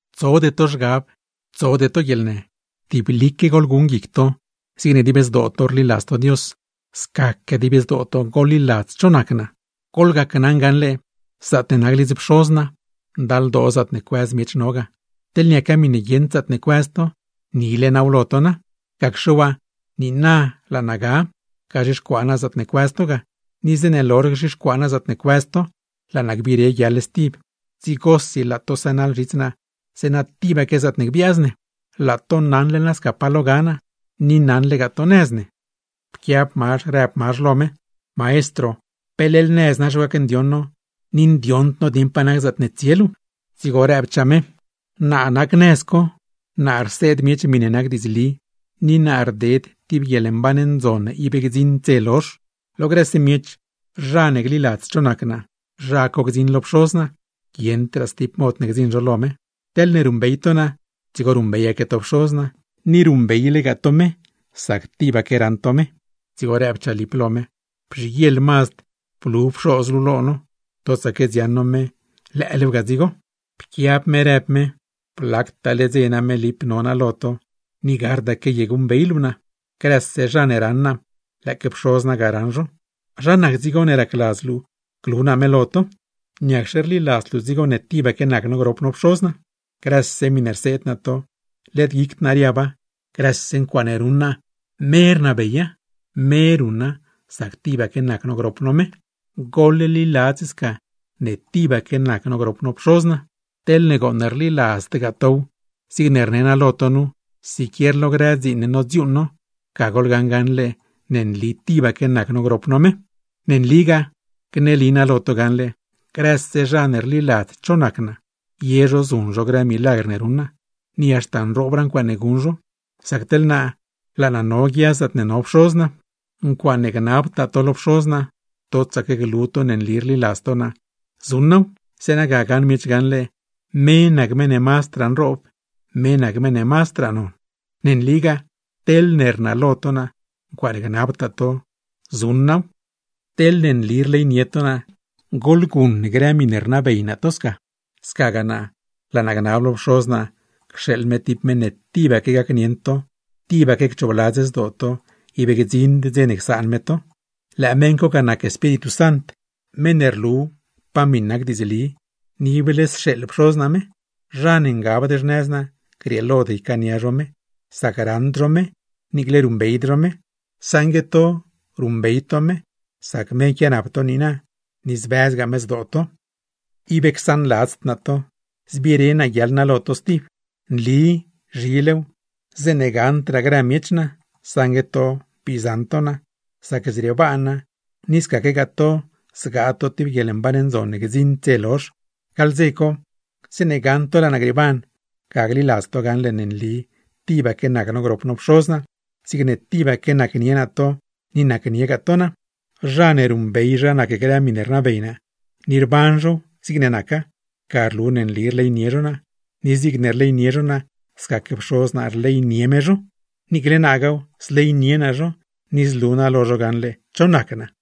’Tsode to zhgab, tsode to guieḻnë. Tiblique goḻguṉ guic to, zigne dib zdoo to rliladz to Dios, scaque dib zdoo to goḻliladz cho nac naa. Goḻgona gaṉle: Zaatne nac lidz Pxoz naa, ndaldoo zaatne cuëz miech no ga, teḻ niaca miṉe guieṉd zaatne cuëz to, nile naaw lo to na. Gacxe waa, niina laa naa ga, gazhixcuaa naa zaatne cuëz to ga. Ni zeeṉe lozh gzhixcuaa naa zaatne cuëz to, hor co laa naa gbire guiaḻ stib, dzigosi laa to sënaḻ zhits naa; zeeṉa tibaque zaatne gbiaaz ne. Laa to naṉle nasca pa lo ga naa, ni naṉlegaa to nëz ne. Pquiab Mazh rëb Mazh lo me: ―Maestro, peleḻ nëz na gacndioṉ no, ni per ni zaatne tsie luu ndioṉd no. Dzigo rëbchaa Jesús: ―Naa nac nëz co, naa rseed miech miṉe nac diidzli, ni naa rded tib guieḻmban ndzon ne ib gdziṉd dze lozh. Lo grëse miech, zha ne gliladz cho nac naa, zha co gdziṉ lo Pxoz naa; guieṉdraa stib mod ne gdziṉ zho lo me. Teḻne ruṉbey to naa, dzigo ruṉbeyaque to Pxoz naa. Ni ruṉbeylegaa to me, sac tibaque raṉ to me. Dzigo rëbchaa Lip lo me: ―Bzhiguieḻ mazd blu Pxoz luu lo no. Totsaque dziaṉ no me, lëëlew ga dzigo. Pquiab Jesús, rëb me: ―Blactaale dze ga name Lip no naa lo to, ni gardaque ye guṉbey luu naa. ¡Grëse zha ne raṉ naa, lëëque Pxoz naa ga raṉ zho! ¿Zha nac dzigo ne racladz luu glu naa me lo to? ¿Niacxe rliladzd luu dzigo ne tibaque nac no grop no Pxoz naa? Grëse miṉe rseed naa to, led guicd naa riaba; grëse ncuaaṉe ruṉ naa, me rnabeya, me ruṉa sac tibaque nac no grop no me. Goḻliladz sca ne tibaque nac no grop no Pxoz naa. Teḻne gooṉ rliladzdgaa tow zigne rnee naa lo to nu, siquier lo grë dziin ne nodziuuṉ no, ga goḻgaṉ gaṉle ne nli tibaque nac no grop no me. ’Ne nligaa, gneli naa lo to gaṉle: Grëse zha ne rliladz cho nac naa, ye zho zuṉ zho grë milagr ne ruṉ naa, ni haxta nroobraa ncuaaṉe guṉ zho; sac teḻ naa, laa naa no guia zaatne no Pxoz naa. Ncuaaṉe gnabtaa to lo Pxoz naa, totsaque glu to ne nli rliladz to naa, zuṉ naaw; zeeṉa ga gaṉ miech gaṉle me nac meṉ ne mazdraa nroob, me nac meṉ ne mazdraa non. Ne nligaa, teḻne rnalo to naa, ncuaaṉe gnabtaa to zuṉ naaw. ’Teḻne nli rleynie to naa, goḻguṉ grë miṉe rnabey naa to sca. Scagaa naa, laa naa gnab lo Pxoz naa cxeeḻ me tib meṉ ne tibaque gacnieṉ to, tibaque cchoobladz zdoo to; ib gdziṉd dze ne csaan me to. ¡Lëë meṉ co ga nac Espíritu Sant, meṉ ne rlu pa miṉ nac diidzli; ni ible sxeeḻ Pxoz naa me! Zha ne ngabd xnëz naa, grieelod ycaania zho me, sac raṉd zho me niicle ruṉbeyd zho me; saṉgue to, ruṉbey to me sac me quianap to niina, ni zbëzgaa me zdoo to. ’Ib csaanladzd naa to, zbire naa guiaḻ naa lo to stib. Nli zhilew, zeeṉe gaṉdraa grë miech naa, saṉgue to goṉ bii zaṉ to naa; sac zriebaan naa, ni scaquegaa to zgaa to tib guieḻmban ndzon ne gdziṉd dze lozh. Gaḻ dze co, zeeṉe gaṉ to laa naa grieeban, ga gliladz to gaṉle ne nli tibaque nac no grop no Pxoz naa, zigne tibaque nacnie naa to ni nacniegaa to naa. Zha ne ruṉbey zha nac grë miṉe rnabey naa, ni rban zhow zigne naca, ga rlu ne nli rleynie zho naa; ni zigne rleynie zho naa, scaque Pxoz naa zleynie me zho; niicle naagaaw zleynie naa zho, ni zlu naa lo zho gaṉle cho nac naa.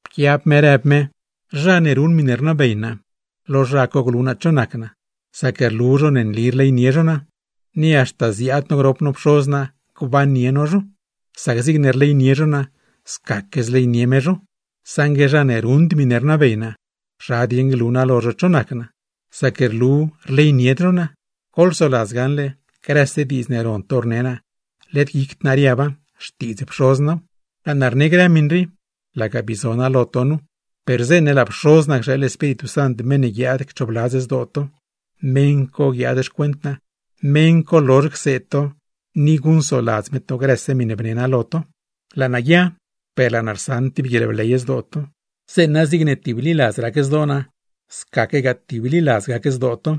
Pquiab me rëb me: ―Zha ne ruṉ miṉe rnabey naa, lo zha co glu naa cho nac naa; sac rlu zho ne nli rleynie zho naa. Ni haxta ziaad no grop no Pxoz naa gbannie no zho; sac zigne rleynie zho naa, scaque zleynie me zho. Saṉgue zha ne ruṉd miṉe rnabey naa, ¿zha dieṉ glu naa lo zho cho nac naa? Sac rlu rleynied zho naa. Goḻsoladz gaṉle: grëse diidz ne ron to rne naa, led guicd naa riaba, xtiidz Pxoz naaw. Laa naa rne grë miṉ rii, laga bii zo naa lo to nu, per zeeṉe laa Pxoz naa cxeeḻ Espíritu Sant meṉ ne guiaad cchoobladz zdoo to (meṉ co guiaad xcuent naa), meṉ co lozh cseed to, ni guṉcsoladz me to grëse miṉe bne naa lo to. ’Laa naa guia, per laa naa rsaṉ tib guieḻbley zdoo to, zeeṉa zigne tibliladz rac zdoo naa, scaque tibliladz gac zdoo to.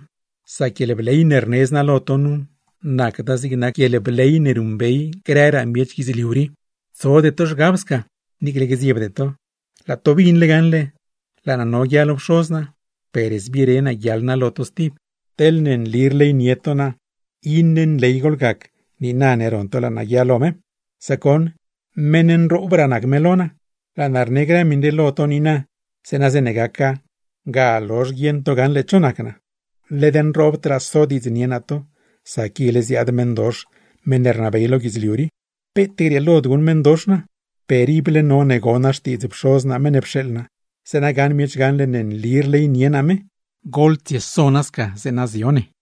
Sac guieḻbley ne rnedz naa lo to nu, nacda zig nac guieḻbley ne ruṉbey grëraa miech guidzliu rii. Tsode to zhgab sca, niicle gdziebde to. Laa to binle gaṉle, laa naa no guia lo Pxoz naa per zbire naa guiaḻ naa lo to stib. Teḻne nli rleynie to naa iṉe nley goḻgac, niina ne ron to laa naa guia lo me, sac goṉ meṉ nroobraa nac me lo naa. Laa naa rne grë miṉ rii lo to niina, zeeṉa zeeṉe gaca, ga lozh guieṉ to gaṉle cho nac naa. ’Led nroobdraa sodiidznie naa to, sac ile ziaad meṉdox, meṉ ne rnabey lo guidzliu rii. Peet grieelod guṉ meṉdox naa, per ible none gon naa xtiidz Pxoz naa meṉ ne pxeeḻ naa, zeeṉa gaṉ miech gaṉle ne nli rleynie naa me. ¡Goḻtsieso nasca, zeeṉa zio ne!